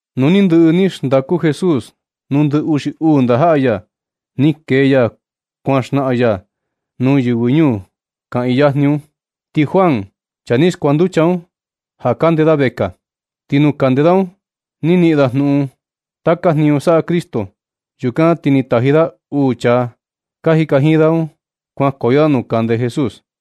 Nu ni ndɨꞌɨ ni xndaku Jesús nuu ndɨ uxi uu ndajaꞌa ya, ni kee ya kuan xnaꞌan ya nuu yɨvɨ ñuu kaꞌiin yajni un. Ti Juan, chaa ni skuanducha un, ja kande da vekaa. Ti nu kande da un, ni niꞌin da jnuꞌun taka jniñu saꞌa Cristo. Yukan ti ni taji da uu chaa ka jika jiin da un kuankoyo da nuu kande Jesús,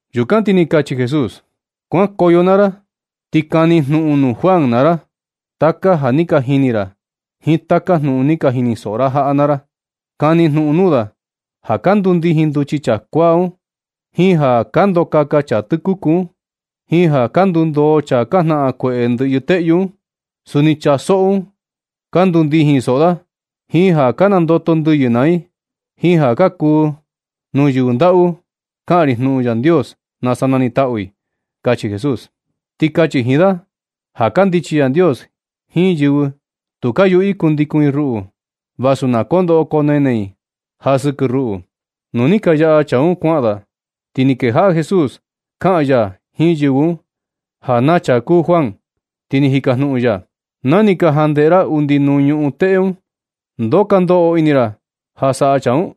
Yukan ti ni kachi Jesús: ―Kuankoyo naa ra ti kani jnuꞌun nuu Juan naa ra taka ja ni ka jini ra jiin taka jnuꞌun ni ka jinisoꞌo ra jaꞌa naa ra. Kani jnuꞌun nuu da ja ka ndundijin nduchi chaa kuaa un, jiin ja ka ndokaka chaa tɨkuku un, jiin ja ka ndundoo chaa ka jnaꞌan kueꞌe ndɨꞌyɨ teꞌyu un. Suni chaa soꞌo un ka ndundijin soꞌo da, jiin ja ka nandoto ndɨyɨ naa i, jiin ja kuu nuu yɨvɨ ndaꞌu kaꞌan ri jnuꞌun Yandios nasa nanitaꞌu i ―kachi Jesús. Ti kachi jiin da ja kandichi Yandios jiin yɨvɨ tu ka yuꞌu i kundikun i ruꞌu, vasu na koo ndoꞌo koo nene i ja sɨkɨ ruꞌu. Nu ni ka yaꞌa chaa un kuaꞌan da, ti ni kejaꞌa Jesús kaꞌan ya jiin yɨvɨ un ja na chaa kuu Juan, ti ni jikajnuꞌun ya: ―Na ni ka jandeꞌe ra undi nuu ñuꞌun teꞌe un, ¿ndoo ka ndoꞌo ini ra ja saꞌa chaa un? Ti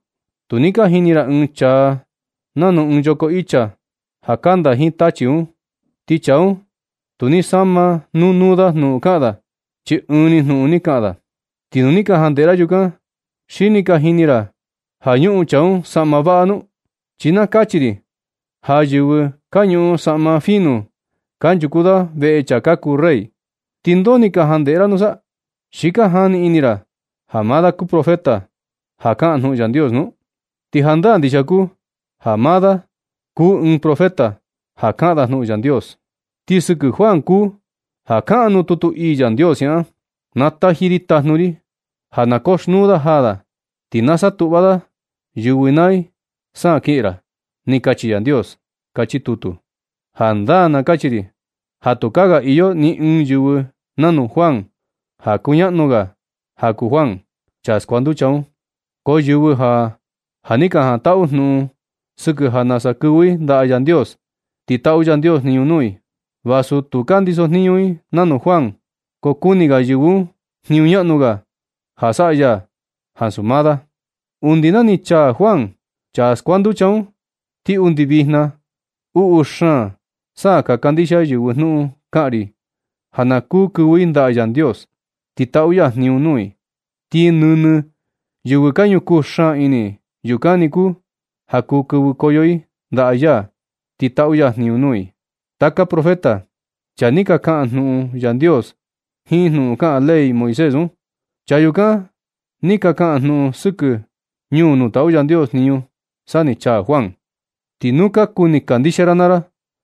tu ni ka jini ra ɨɨn chaa un nanu ɨɨn yoko icha ja kanda jiin tachi un, ti chaa un tu ni sama nuu nuu da jnuꞌun kaꞌan da, chi ɨɨn ni jnuꞌun ni kaꞌan da. Ti nu ni ka jandeꞌe ra yukan, ¿Xi ni ka jini ra ja ñuꞌun chaa un saꞌma vaꞌa nu? Chi na kachi ri ja yɨvɨ ka ñuꞌun saꞌma fino kanchuku da veꞌe chaa ka kuu rey. ¿Ti ndoo ni ka jandeꞌe ra nusa? ¿Xi ka jani ini ra ja maa da kuu profeta ja kaꞌan jnuꞌun Yandios nu? Ti jandaa ndixia kuu ja maa da kuu da ɨɨn profeta ja kaꞌan da jnuꞌun Yandios. Ti sɨkɨ Juan kuu ja kaꞌan nuu tutu ii Yandios siaꞌan: Na taji ri tajnu ri ja na koxnuu da jaa da. Ti na satuꞌva da yɨvɨ naa i sa kiꞌin ra. Ni kachi Yandios, kachi tutu. Jandaa na kachi ri ja tukaa ga iyo ni ɨɨn yɨvɨ nanu Juan ja kuñaꞌnu ga ja kuu Juan, chaa skuanducha un. Ko yɨvɨ ja, ja ni ka jantaꞌu jnuꞌun sɨkɨ ja nasa kɨvɨ i ndaꞌa Yandios, ti taꞌu Yandios jniñu nuu i, vasu tu ka ndiso jniñu i nanu Juan, ko kuni ga yɨvɨ un jniñu ñaꞌnu ga ja saꞌa ya ansu maa da. Undi na ni chaa Juan, chaa skuanducha un, ti undi vijna, uꞌu xaan sa ka kandixia yɨvɨ jnuꞌun kaꞌan ri ja na kuu kɨvɨ i ndaꞌa Yandios, ti taꞌu ya jniñu nuu i. Ti nɨnɨ yɨvɨ ka ñukuu xaan ini, yukan ni kuu ja kuu kɨvɨkoyo i ndaꞌa ya, ti taꞌu ya jniñu nuu i. Taka profeta, chaa ni ka kaꞌan jnuꞌun Yandios jiin jnuꞌun kaꞌan ley Moisés un, chaa yukan ni ka kaꞌan jnuꞌun sɨkɨ ñuu nuu taꞌu Yandios jniñu, sa ni chaa Juan. Ti nu ka kuni kandixia ra naa ra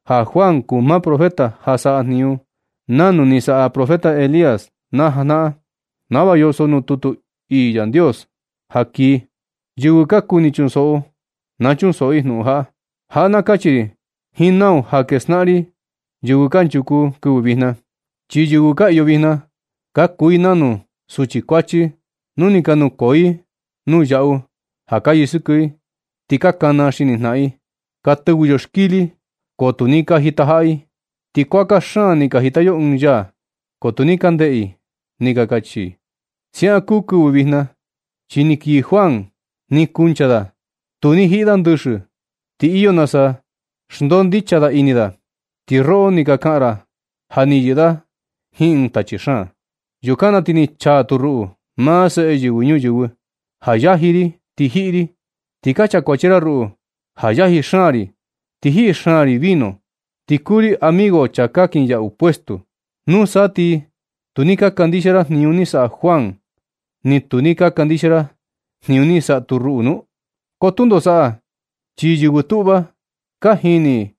ja Juan kuu maa profeta ja saꞌa jniñu nanu ni saꞌa profeta Elías na janaꞌan, nava yoso nuu tutu Yandios ja kii. Yɨvɨ ka kuni chunsoꞌo, na chunsoꞌo i jnuꞌun jaꞌa. Jaꞌa na kachi ri jiin nau ja skejnaꞌan ri yɨvɨ kanchuku kɨvɨ vijna. Chi yɨvɨ ka iyo vijna ka kuu i nanu suchi kuachi nu ni ka nukoo i nuu yaꞌu ja ka yɨsɨkɨ i, ti ka kana xini jnaꞌan i, “Ka tɨvɨ yo xkili, ko tu ni ka jitajaꞌa i. Ti kuaka xaan ni ka jita yo ɨɨn yaa, ko tu ni ka ndeꞌe i”, ni ka kachi i. Siaꞌan kuu kɨvɨ vijna, chi ni kii Juan, ni kuncha da. Tu ni jiꞌi da ndɨxɨ, ti iyo nasa xndondicha da ini da. Ti roꞌo ni ka kaꞌan ra ja ni yɨꞌɨ da jiin ɨɨn tachi xaan. Yukan na ti ni chaa tu ruꞌu, maa Seꞌe Yɨvɨ Ñuyɨvɨ, ja yaji ri ti jiꞌi ri, ti ka chakuachi ra ruꞌu ja yaji xaan ri ti jiꞌi xaan ri vino, ti kuu ri amigo chaa ka kinyaꞌu puesto. ¿Nusa ti tu ni ka kandixia ra jniñu ni saꞌa Juan, ni tu ni ka kandixia ra jniñu ni saꞌa tu ruꞌu nu? Ko tundo saꞌa, chi yɨvɨ tuꞌva, ka jini i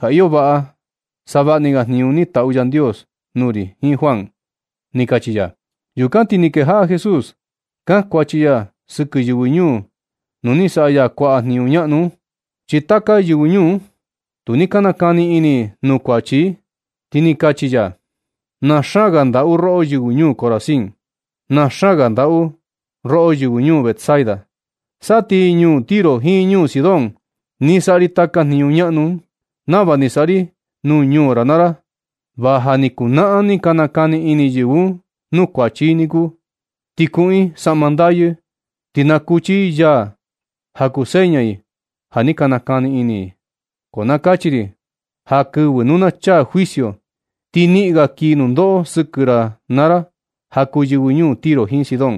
ja iyo vaꞌa savaꞌa ni ga jniñu ni taꞌu Yandios nuu ri jiin Juan ―ni kachi ya. Yukan ti ni kejaꞌa Jesús kankuachi ya sɨkɨ yɨvɨ ñuu nuu ni saꞌa ya kuaꞌa jniñu ñaꞌnu un, chi taka yɨvɨ ñuu un, tu ni ka nakani ini i nuu kuachi i, ti ni kachi ya: ―¡Na xaan ga xndaꞌu roꞌo, yɨvɨ ñuu Corazín! ¡Na xaan ga xndaꞌu roꞌo, yɨvɨ ñuu Betsaida! Sa ti ñuu Tiro jiin ñuu Sidón ni saꞌa ri taka jniñu ñaꞌnu un nava ni saꞌa ri nuu ñuu ra naa ra, va ja ni kuu jnaꞌan ni ka nakani ini yɨvɨ un nuu kuachi i niku. Ti kuꞌun i saꞌma ndayɨ, ti nakuchi i yaa ja na kuu seña i ja ni ka nakani ini i. Ko na kachi ri ja kɨvɨ nu na chaa juicio ti niꞌin ga kii nundoꞌo sɨkɨ ra naa ra ja kuu yɨvɨ ñuu Tiro jiin Sidón.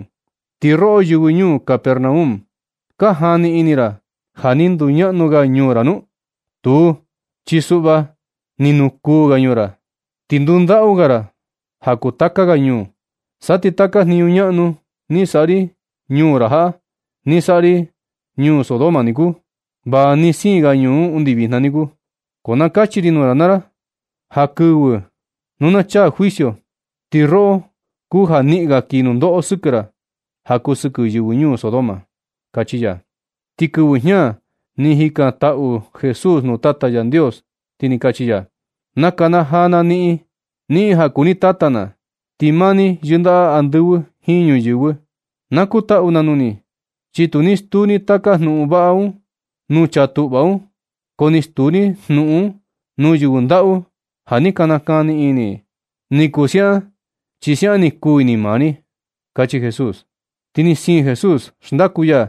Ti roꞌo, yɨvɨ ñuu Capernaum, ¿ka jani ini ra ja ni nduñaꞌnu ga ñuu ra nu? Tuu, chi suꞌva ni nukuu ga ñuu ra, ti ndundaꞌu ga ra ja kuu taka ga ñuu. Sa ti taka jniñu ñaꞌnu ni saꞌa ri ñuu ra jaꞌa, ni saꞌa ri ñuu Sodoma niku, va ni siin ga ñuu un undi vijna niku. Ko na kachi ri nuu ra naa ra ja kɨvɨ nu na chaa juicio, ti roꞌo kuu ja niꞌin ga kii nundoꞌo sɨkɨ ra ja kuu sɨkɨ yɨvɨ ñuu Sodoma ―kachi ya. Ti kɨvɨ jña ni jikantaꞌu Jesús nuu Tata ya Yandios, ti ni kachi ya: ―Nakanajaa na niꞌin, niꞌin ja kuu ni Tata na, ti maa ni yindaꞌa andɨvɨ jiin ñuyɨvɨ. Nakutaꞌu na nuu ni, chi tu ni stuu ni taka jnuꞌun vaꞌa un nuu chaa tuꞌva un, ko ni stuu ni jnuꞌun un nuu yɨvɨ ndaꞌu ja ni ka nakani ini. Ni kuu siaꞌan, chi siaꞌan ni kuu ini maa ni ―kachi Jesús. Ti ni siin Jesús xndaku ya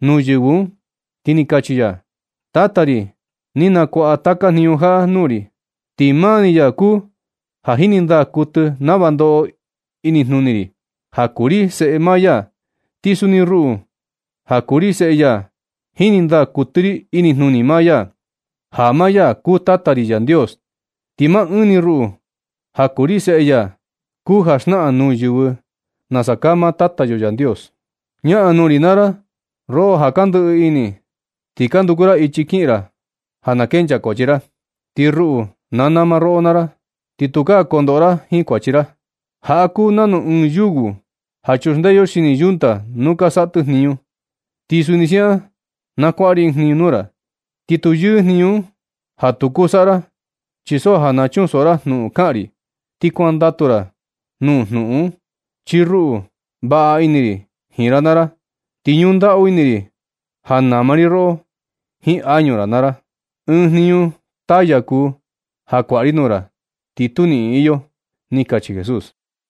nuu yɨvɨ un, ti ni kachi ya: ―Tata ri, ni nakuaꞌa taka jniñu jaꞌa nuu ri. Ti maa ni ya kuu ja jini ndaa kuɨtɨ nava ndoꞌo inijnuni ri, ja kuu ri Seꞌe maa ya. Ti suni ruꞌu, ja kuu ri Seꞌe ya, jini ndaa kuɨtɨ ri inijnuni maa ya, ja maa ya kuu Tata ri Yandios. Ti maa ɨɨn ni ruꞌu, ja kuu ri Seꞌe ya, kuu ja xnaꞌan nuu yɨvɨ nasa kaa maa Tata yo Yandios. Ñaꞌan nuu ri naa ra roꞌo ja ka ndɨꞌɨ ini, ti ka nduku ra ichi kiꞌin ra ja na kenchaa kuachi ra, ti ruꞌu na nama roꞌo naa ra, ti tukaa kondoꞌo ra jiin kuachi ra. Jaꞌa kuu nanu ɨɨn yugo ja chuxndee yo xini yunta nu ka saꞌa tɨ jniñu, ti suni siaꞌan na kuaꞌa ri ɨɨn jniñu nuu ra, ti tu yɨɨ jniñu un, ja tu kuu saꞌa ra. Chi so ja na chunsoꞌo ra jnuꞌun kaꞌan ri, ti kuandatu ra nuu jnuꞌun un. Chi ruꞌu, vaꞌa ini ri jiin ra naa ra, ti ñundaꞌu ini ri ja nama ri roꞌo jiin añu ra naa ra. Ɨɨn jniñu taya kuu ja kuaꞌa ri nuu ra, ti tu niꞌin iyo ―ni kachi Jesús.